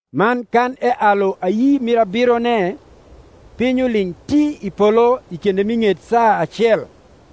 Man kan ealu ayi mir abirone, piny uling’ ti i polo i kinde mi ng’et saa acel.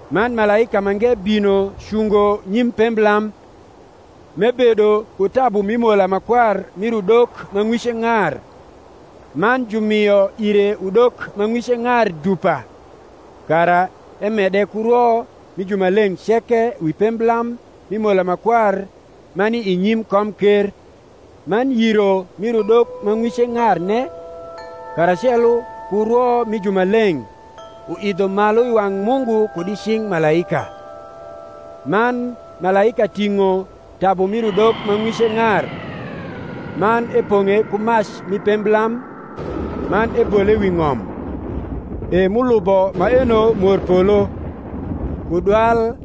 Man malaika mange bino cungo nyim pemblam, m’ebedo ku tabu mi mola ma kwar mir udok ma ng’wice ng’ar; man jumio ire udok ma ng’wice ng’ar dupa, kara emede ku rwo mi jumaleng’ ceke wi pemblam mi mola ma kwar, ma ni i nyim komker. Man yiro mir udok ma ng’wice ng’arne, karacelo ku rwo mi jumaleng’, uidho malu i wang’ Mungu kud i cing’ malaika. Man malaika ting’o tabu mir udok ma ng’wice ng’ar; man epong’e ku mac mi pemblam, man ebole wi ng’om: e m’ulubo maeno morpolo, ku dwal,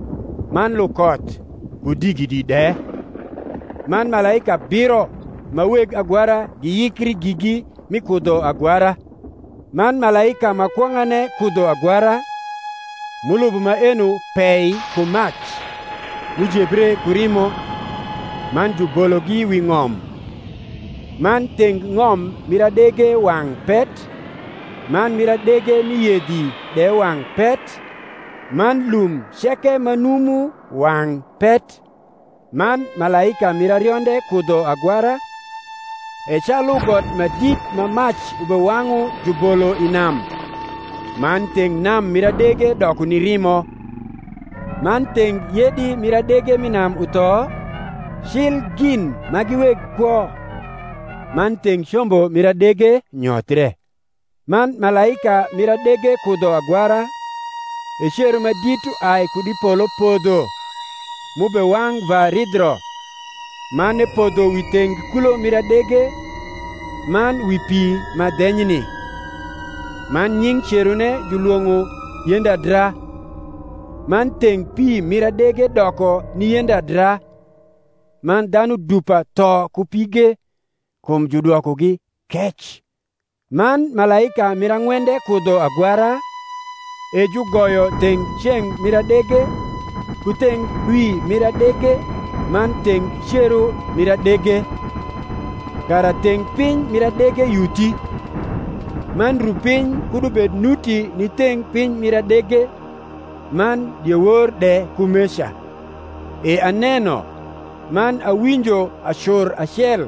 man lukoth, ku digidi de. Man malaika abiro ma weg agwara giyikri gigi mi kudho agwara. Man malaika ma kwong’ane kudho agwara, m’ulubo maeno pei ku mac, m’ujebre ku rimo, man jubologi wi ng’om: man theng ng’om mir adege wang’ pet, man mir adege mi yedhi de wang’ pet, man lum ceke ma numu wang’ pet. Man malaika mir arionde kudho agwara, e calu got ma dit ma mac ubewang’u jubolo i nam: man theng nam mir adege doko ni rimo; man theng yedi mir adege m’i nam utho, cil gin ma gi weg kwo; man theng combo mir adege nyothre. Man malaika mir adege kudho agwara, e cero ma dit uai kud i polo podho, m’ubewang’ va ridhro, man epodho wi theng kulo mir adege, man wi pi ma dhenyni; man nying’ cerone julwong’o Yendadra: man theng pi mir adege doko ni yendadra; man dhanu dupa tho ku pige, kum judwokogi kec. Man malaika mir ang’wende kudho agwara, e jugoyo theng ceng’ mir adege, ku theng dwi mir adege, man theng cero mir adege; kara theng piny mir adege yuthi, man rupiny kud ubed nuti ni theng piny mir adege, man diewor de kumeca. E aneno, man awinjo acur acel,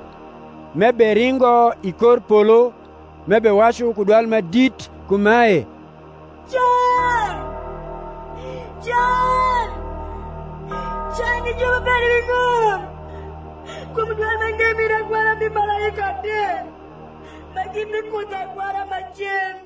m’eberingo i kor polo, m’ebewacu ku dwal ma dit kumae, Can, can, can, ni ju m’ubedo wi ng’om, kum dwal mange mir agwara mi malaika adek, ma gibikudho agwara macen.